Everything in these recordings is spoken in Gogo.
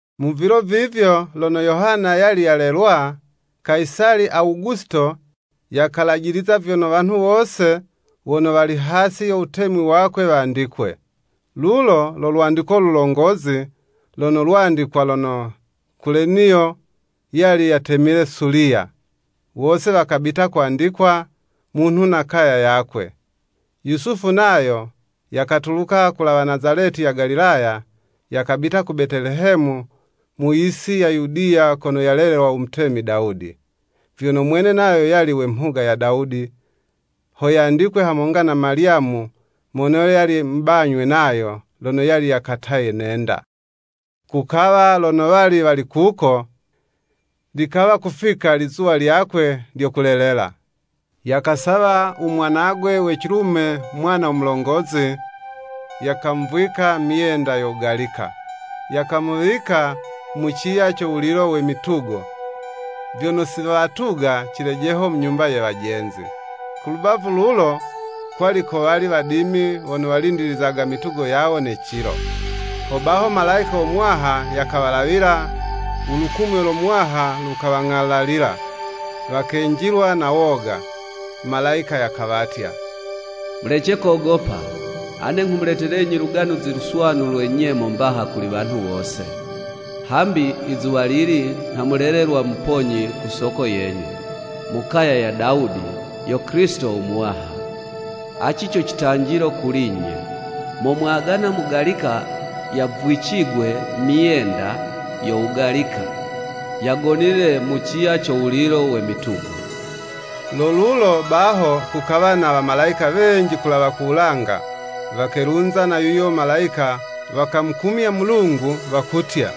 Mu vilo vivyo lono Yohana yali yalelwa, Kayisali Awugusito, yakalajiliza vyono wanhu wose wono wali hasi yo wutemi wakwe wandikwe. Lulo lo lwandiko lulongozi lono lwandikwa lono Kuleniyo yali yatemile Suliya. Wose wakabita kwandikwa, munhu na kaya yakwe. Yusufu nayo yakatuluka kulawa Nazaleti ya Galilaya, yakabita ku Betelehemu mu yisi ya Yudiya kono yalelelwa u mutemi Dawudi. Vyono mwene nayo yali we mhuga ya Dawudi, ho yandikwe hamonga na Malyamu, mono yali mubanywe nayo, lono yali yakataye ne'nda. Kukawa lono wali wali kuko, likawa kufika lizuwa lyakwe lyo kulelela. Yakasawa u mwanagwe we cilume mwana mulongozi, yakamuvwika myenda yo wugalika, yakamuwika mu ciya co wulilo we mitugo, vyono siwatuga cilejeho mu nyumba ye wajenzi. Ku lubavu lulo, kwali kowali wadimi wono walindilizaga mitugo yawo ne cilo. Hobaho Malayika wo Muwaha yakawalawila, u lukumyo lo Muwaha lukawang'alalila, wakenjilwa na woga. Malayika yakawatya, “Mulece kogopa, ane nghumuletelenyi Luganuzi Luswanu lwe nyemo mbaha kuli wanhu wose, hambi izuwalili nha mulelelwa Muponyi ku soko yenyu, mu kaya ya Dawudi, yo Kilisito u Muwaha. Aci co citanjilo kuli'nye, Momwagana mugalika yavwicigwe myenda yo wugalika, yagonile mu ciya co wulilo we mitugo.” Lo lulo baho kukawa na Wamalayika wenji kulawa ku wulanga, wakelunza na yuyo Malayika, wakamukumya Mulungu wakutya,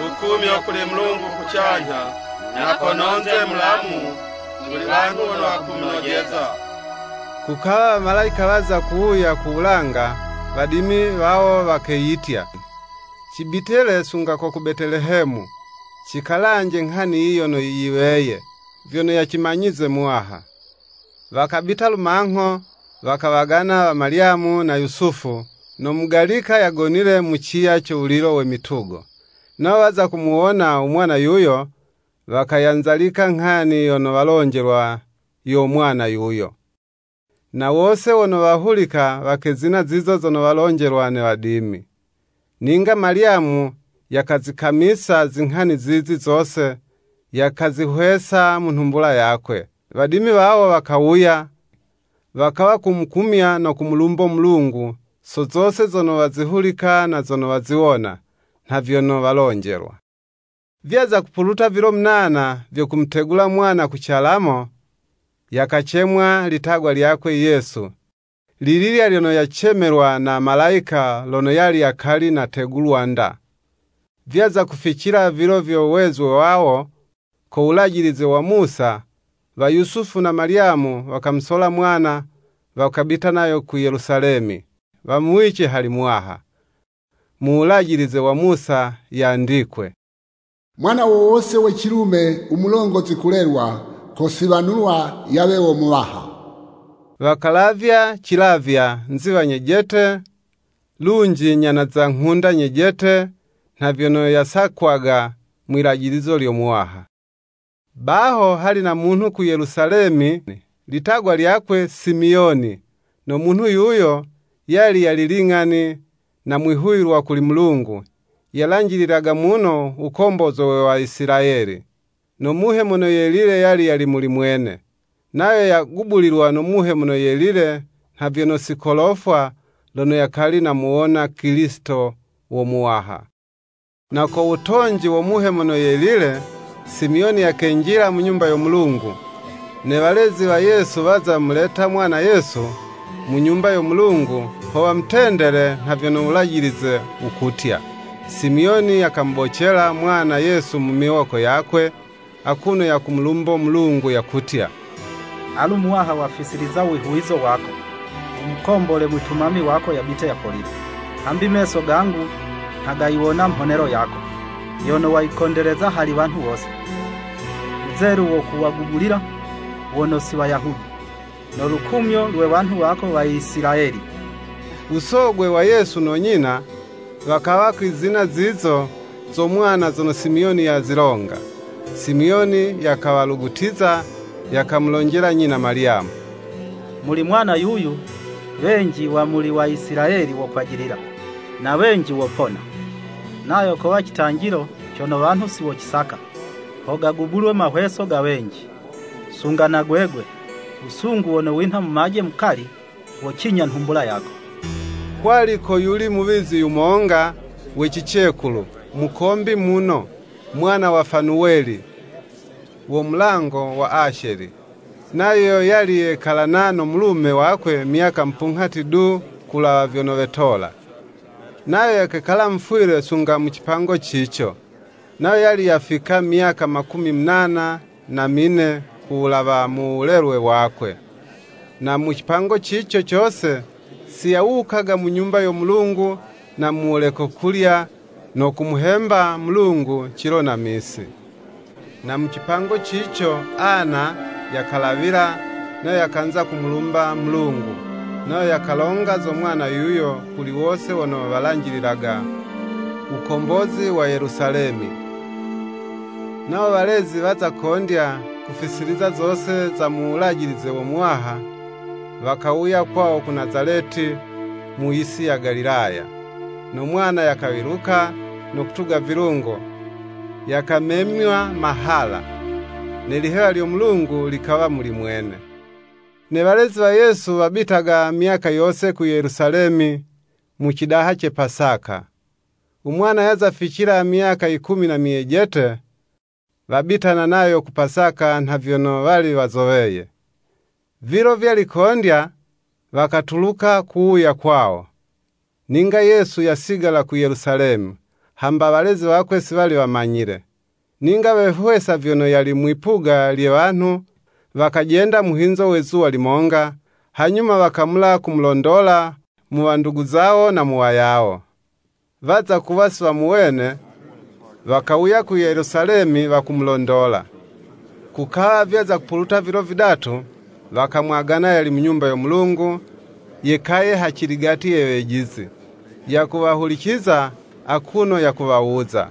“Lukumyo kuli Mulungu kucanyha, na kono'nze mulamu kuli wanhu wono wakumunojeza.” Kukawa Wamalayika waza kuwuya ku wulanga, wadimi wawo wakeyitya, cibite le sunga ko ku Betelehemu, cikalanje nghani yiyi yono yiweye, vyono yacimanyize Muwaha. Wakabita lumangho, wakawagana wa Malyamu na Yusufu, no mugalika yagonile mu ciya co wulilo we mitugo. Nawo waza kumuwona u mwana yuyo, wakayanzalika nghani yono walonjelwa yo mwana yuyo. Na wose wono wahulika wakezina zizo zono walonjelwa ne wadimi. Ninga Malyamu yakazikamisa zinghani zizi zose, yakazihwesa mu nhumbula yakwe. Wadimi wawo wakawuya, wakawa kumukumya no kumulumbo Mulungu, so zose zono wazihulika na zono waziwona, nha vyono walonjelwa. Vyaza kupuluta vilo munana vyo kumutegula mwana ku calamo, yakacemwa litagwa lyakwe, YESU, lililya lyono yacemelwa na Malayika lono yali yakali nategulwa 'nda. Vyaza kuficila vilo vyo wezwe wawo, ko wulajilize wa Musa, wa Yusufu na Malyamu wakamusola mwana, wakabita nayo ku Yelusalemi, wamuwice hali Muwaha. Mu Wulajilize wa Musa yandikwe “Mwana wo wose we cilume u mulongozi kulelwa, kosiwanulwa yawe wo Muwaha.” Wakalavya cilavywa, Nziwa nyejete, lunji nyana za nghunda nyejete, nha vyono yasakwaga mwilajilizo lyo Muwaha. Baho hali na munhu ku Yelusalemi litagwa lyakwe Simiyoni, no munhu yuyo, yali yali ling'ani na mwihuwilwa kuli Mulungu, yalanjililaga muno wukombozwe we Waisilayeli. No Muhe Mono Yelile yali yali muli mwene. Nayo yagubulilwa no Muhe Mono Yelile nha vyono si kolofwa, lono yakali namuwona Kilisito wo Muwaha. Na ko wutonji wo Muhe Mono Yelile, Simiyoni yakenjila mu Nyumba yo Mulungu, ne walezi wa Yesu waza muleta mwana Yesu, mu Nyumba yo Mulungu, ho wamutendele nha vyono Wulajilize wukutya. Simiyoni yamubocela mwana Yesu mu miwoko yakwe, akuno yakumulumbo Mulungu, yakutya, “Alu Muwaha wafisiliza wihuwizo wako, wumukombole mwitumami wako yabite yapolile. Hambi meso gangu nha gayiwona mhonelo yako. Yono wayikondeleza hali wanhu wose. Wuzelu wo kuwagubulila wono si Wayahudi. No lukumyo lwe wanhu wako Waisilayeli.” U sogwe wa Yesu no nyina, wakawa kwizina zizo zo mwana zono Simiyoni yazilonga. Simiyoni yakawalugutiza, yakamulonjela nyina Malyamu, “Muli mwana yuyu, wenji wa muli Waisilayeli wokwajilila, na wenji wopona. Nayo kowa citanjilo cono wanhu siwocisaka, ho gagubulwe mahweso ga wenji, sunga na gwegwe, wusungu wono winha mumaje mukali, wocinya nhumbula yako.” Kwali koyuli muwizi yumonga wa cicekulu, mukombi muno, mwana wa Fanuweli, wo mulango wa Asheli, nayo yali yekalana no mulume wakwe myaka mupunghati du kulawa vyono wetola. Nayo yakekala mufwile sunga mu cipango cico, nayo yali yafika myaka makumi munana na mine ku wulawa u wulelwe wakwe. Na mu cipango cico cose, si yawukaga mu Nyumba yo Mulungu, na mu wuleko kulya, no kumuhemba Mulungu cilo na misi. Na mu cipango cico Ana yakalawila, nayo yakanza kumulumba Mulungu, nayo yakalonga zo mwana yuyo kuli wose wono walanjililaga wukombozi wa Yelusalemi. Nawo walezi waza kondya kufisiliza zose za mu wulajilize wo Muwaha, wakawuya kwawo ku Nazaleti mu yisi ya Galilaya. No mwana yakawiluka, no kutuga vilungo, yakamemywa mahala, ne lihewa lyo Mulungu likawa muli mwene. Ne walezi wa Yesu wabitaga myaka yose ku Yelusalemi, mu cidaha ce Pasaka. U mwana yaza ficila myaka yikumi na myejete, wabitana nayo ku Pasaka nha vyono wali wazoweye. Vilo vyali kondya, wakatuluka kuwuya kwawo. Ninga Yesu yasigala ku Yelusalemi, hamba walezi wakwe si wali wamanyile. Ninga wehwesa vyono yali mwipuga lye wanhu, wakajenda muhinzo we zuwa limonga, hanyuma wakamula kumulondola mu wandugu zawo na mu wayawo, waza kuwa si wamuwene, wakawuya ku Yelusalemi, wakumulondola. Kukawa vyaza kupuluta vilo vidatu, wakamwagana yali mu Nyumba yo Mulungu yekaye haciligati ye wejizi, yakuwahuliciza, akuno yakuwawuza: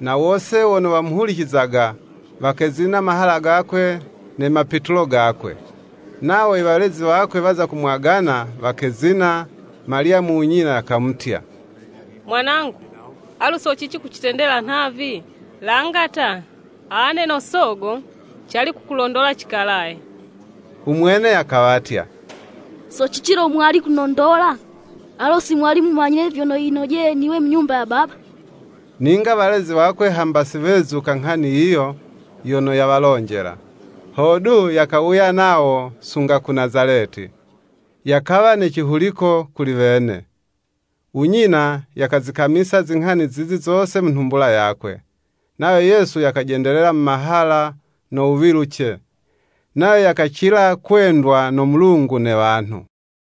na wose wono wamuhulicizaga, wakezina mahala gakwe ne mapitulo gakwe. Nawo i walezi wakwe waza kumwagana, wakezina. Malyamu u nyina, yakamutya, “Mwanangu, alo so cici kucitendela nhavi? Langa ta, ane no sogo, cali kukulondola cikalaye.” U mwene yakawatya, “So cici lo mwali kunondola? Alo si mwali mumanyile vyono yinojeye niwe mu Nyumba ya Baba?” Ninga walezi wakwe hamba si wezuka nghani yiyo yono yawalonjela. Hodu, yakawuya nawo sunga ku Nazaleti. Yakawa ne cihuliko kuli wene. U nyina yakazikamisa zinghani zizi zose mu nhumbula yakwe. Nayo Yesu yakajendelela mu mahala no wuwiluce, nayo yakacila kwendwa no Mulungu ne wanhu.